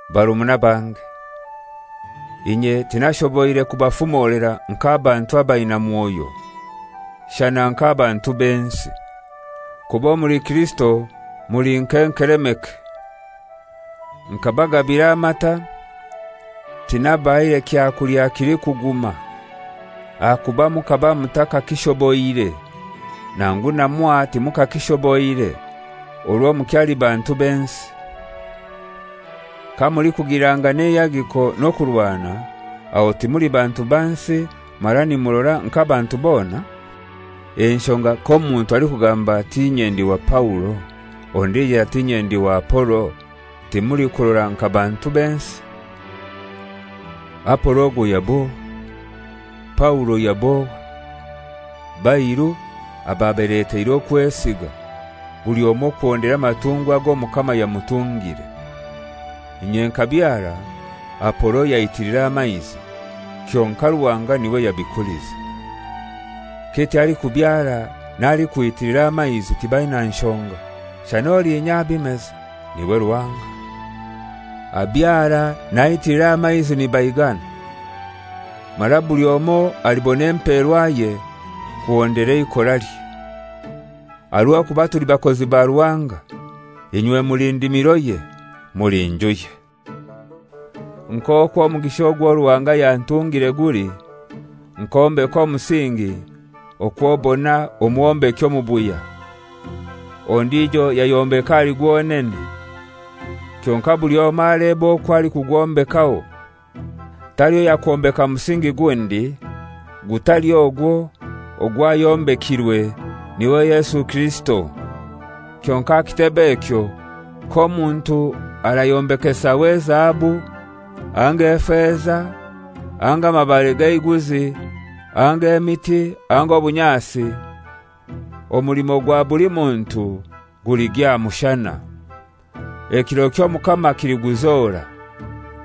Barumuna bange, inye tinashoboire kubafumolera nk'abantu abaina Mwoyo, shana nk'abantu b'ensi; kuba omuli Kirisito muli nk'enkelemeke. Nkabagambira amata, tinabahaire kyakulya kilikuguma, ahakuba mukaba mutakakishoboire; nangu na mwaha timukakishoboire, orwo mukyali bantu b'ensi. Kamulikugilirangana eihagiko n'okurwana, aho timuli bantu ba nsi, mara nimurora nk'abantu bona? Enshonga k'omuntu alikugamba ati, «Inye ndi wa Paulo,» ondijo ati, «Inye ndi wa Apolo,» timulikurora nka bantu b'ensi? Apolo ogwo yab'ohai? Paulo yab'ohai? Bairu ababaleteire okwesiga, buli omoi kuhondera amatungwa ag'Omukama yamutungire. Inye nkabyara, Apolo yaitiilira amaizi, kyonkai Ruhanga n'iwe yabikulize. Kityo alikubyara n'alikwitilira amaizi tibaina nshonga, shana olinya abimeza. N'iwe Ruhanga. Abyara n'aitilira amaizi nibaigana, mara buli omoi alibona emperwaye kuhondera eikoralye. Aha rw'okuba tuli bakozi ba Ruhanga; inywe muli ndimiroye; muli njuye. Nk'okwo omugisha ogwo Ruhanga yantungire guli, nkombeka omusingi okw'obona omwombeki omubuya; ondijo yayombeka ahali gwonene. Kyonkai buli omoi alebe okwo alikukyombekaho. Taliho yakwombeka musingi gundi, gutali ogwo ogwayombekirwe, n'iwe Yesu Kirisito. Kyonkai aha kitebe ekyo k'omuntu arayombekesaho ezahabu anga efeza anga amabare g'eiguzi anga emiti anga obunyasi, omulimo gwa buli muntu guligya aha mushana. Ekiro ky'Omukama kiliguzora,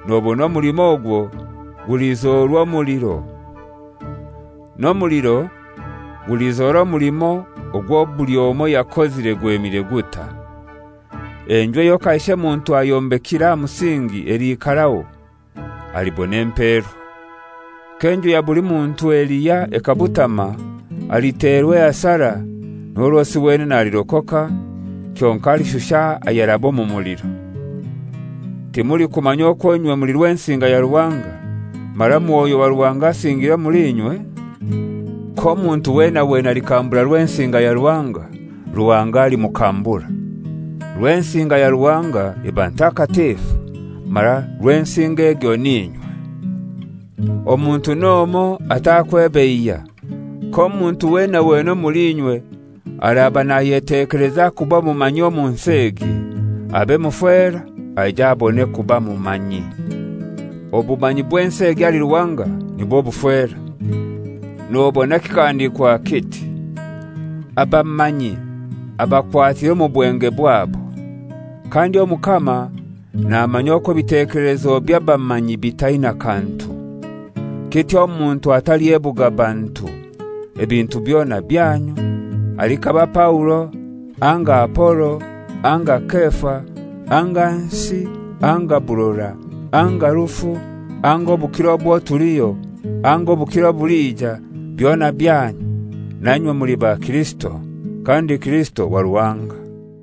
nobona omulimo ogwo gulizorwa omuliro, n'omuliro gulizora omulimo ogwo buli omoi yakozire gwemire gutai. Enju eyo kaishe muntu ayombekire aha musingi eliikaraho, alibona emperwa. K'enju ya buli muntu elihya ekabutama, aliterwa ehasara, n'orwosi wenene alirokoka, kyonkai alishusha ayaraba omu muliro. Timulikumanya okwo inywe muli Rwensinga ya Ruhanga, mara Mwoyo wa Ruhanga asingiire omuli inywe? K'omuntu wena wena alikambura Rwensinga ya Ruhanga, Ruhanga alimukambura. Rwensinga ya Ruhanga eba ntakatifu, mara Rwensinga egyo n'inywe. Omuntu n'omoi atakwebeiya. K'omuntu wena wena omuli inywe araba nayetekeleza kuba mumanyi omu nsi egi, abe mufera aije abone kuba mumanyi. Obumanyi bw'ensi egi ahali Ruhanga nibwo bufera. Nobona kikahandiikwa kiti, «Abamanyi abakwatira omu bwenge bwabo,» kandi, «Omukama namanya okwo ebitekelezo by'abamanyi bitaina kantu.» Kityo omuntu atalyebuga bantu. Ebintu byona byanyu, alikaba Paulo anga Apolo anga Kefa anga nsi anga burora anga rufu anga obukiro obwo tuliho anga obukiro obulija, byona byanyu; na inywe muli ba Kirisito; kandi Kirisito wa Ruhanga.